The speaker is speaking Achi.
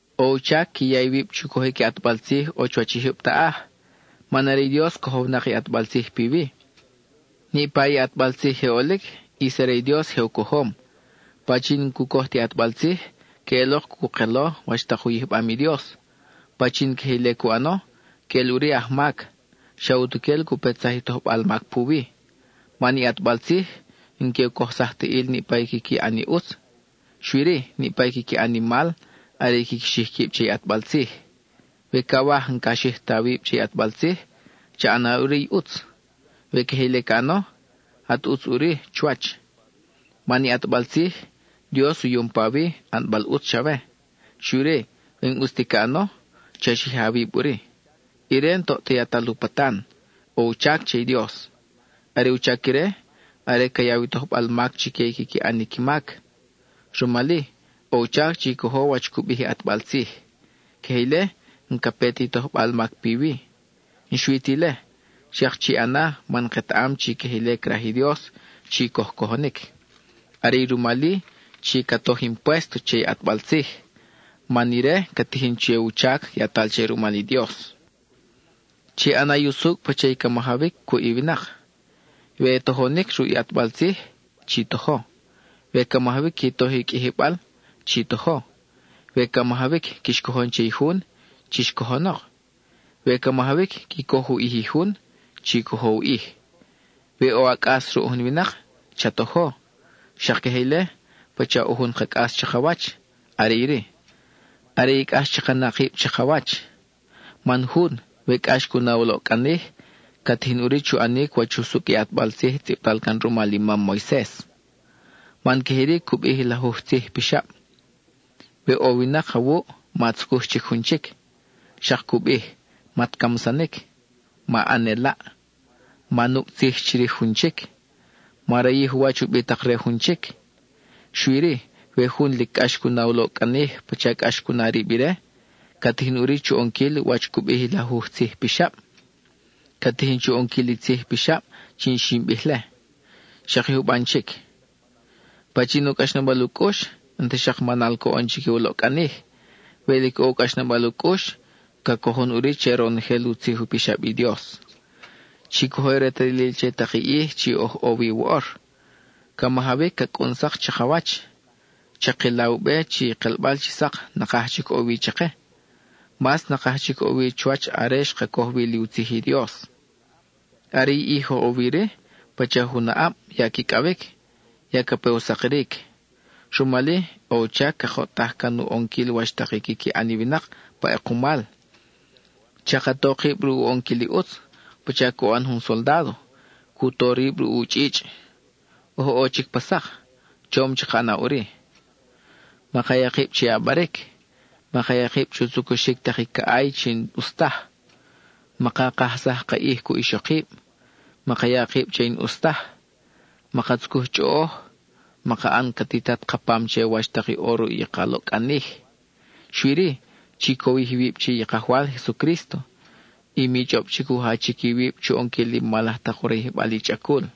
ʼO u chac qui ya iwib chu cojic i ʼatbal tzij ʼo chuwach i jyub taʼaj, man are i Dios cojownak i ʼatbal tzij piwi. Niʼpa i ʼatbal tzij je ʼolic, ʼis are i Dios je u cojom. Pachin n-cu coj ti ʼatbal tzij, queʼelok cu kelo wach tak u yijbam i Dios. Pachin queje ile cu ʼano, queʼel ʼuri aj mac; xa utuquel cu petsaj i tojbal mac puwi. Man i ʼatbal tzij, n-que u ocsaj ta ʼil niʼpa i quiqui ʼan i ʼutz, xui-ri, niʼpa i quiqui ʼan i mal are i quiqui xij quib che i ʼatbal tzij. We cawaj n-ca xij ta awib che i ʼatbal tzij, cha ʼana ʼuri i ʼutz. We queje ile ca ʼano, at ʼutz ʼuri chuwach. Man i ʼatbal tzij, Dios u yom pawi, ʼanbal ʼutz chawe. Xui-ri, we n-ʼus ti ca ʼano, cha xija awib ʼuri. Ire n-toʼ ta yatal u patan; ʼo u chac che i Dios. Are u chac ire, are ca yaw i tojbal mac chique i quiqui ʼan qui mac. Rumal-i, ʼo u chac chi cojo wach cu bij i ʼatbal tzij. Queje ile, n-ca pe ti tojbal mac piwi; n-xui ti ile, xak chi ʼana man ketaʼam chi queje ile craj i Dios, chi coj cojonic. Are i rumal-i, chi ca toj i impuésto che i ʼatbal tzij; man ire ca tijin che u chac yatal che rumal i Dios. Chi ʼana i usucʼ pacha i ca majawic cuʼ i winak. We tojonic ruʼ i ʼatbal tzij, chi tojo; we ca majawic qui toj i qʼuijibal, chi tojo; we ca majawic quix cojon che i jun, chix co-jonok; we ca majawic qui coj u ʼij i jun, chi cojo u ʼij. We ʼo a cʼas ruʼ jun winak, cha tojo. Xak queje ile, pacha ʼo jun ka cʼas chakawach, are iri: are i cʼax chaka na kib chakawach. Man jun, we cʼax cu na u loʼcʼanij, ca tijin ʼuri chu ʼanic wach usucʼ i ʼatbal tzij tzʼibtal can rumal i mam Moises. Man queje iri cu bij i lajuj tzij pixab: we ʼo winak awuʼ, ma tzucuj chic jun chic; xak cu bij: mat camsanic, ma ʼan ʼelaʼ, ma nucʼ tzij chirij jun chic, ma rayij u wach u bitak re jun chic. Xui-ri we jun lic cʼax cu na u loʼcʼanij pacha cʼax cu na rib ire, ca tijin ʼuri chu ʼonquil wach cu bij i lajuj tzij pixab; ca tijin chu ʼonquil i tzij pixab chi xin bij-le, xak i juban chic. Pachin ʼo cʼaxnabal u cʼux, n-ta xak manal coʼon chique u loʼcʼanij; we lic ʼo u cʼaxnabal u cʼux, ca cojon ʼuri che ronojel u tzij u pixab i Dios. Chi cojo retalil che tak i ʼij chi oj ʼo wi woʼor; ca majawic ca cʼun sak chakawach. Chakila u be chi i kelbal chi sak nakaj chic ʼo wi chake; mas nakaj chic ʼo wi chuwach are xka coj wi li u tzij i Dios. Are i ʼij oj ʼo wi-ri, pacha jun aʼab ya quicʼawic, ya ca pe u sakiric. Rumal-i, ʼo u chac cakoʼtaj can u ʼonquil wach tak i quiqui ʼan i winak pa ʼekumal. Chaka to kib ruʼ u ʼonquil i ʼutz, pacha cu ʼan jun soldádo, cu to rib ruʼ u chʼichʼ. Oj ʼo chic pa sak, chom chaka ʼana ʼuri. Maka ya kib che ʼabaric; maka ya kib chu tzucuxic tak i caʼay chi n-ʼus taj; maka kajsaj ka ʼij cuʼ ixokib; maka ya kib che i n-ʼus taj; maka tzucuj chʼoʼoj; maka ʼan ca titat ka pam che wach tak i ʼo ruʼ i ka loʼcʼanij. Xui-ri, chi cowij iwib che i Kajwal Jesucrísto; y mi chʼob chic u jachic iwib chu ʼonquil i mal laj tak u rayijbal i chʼacul.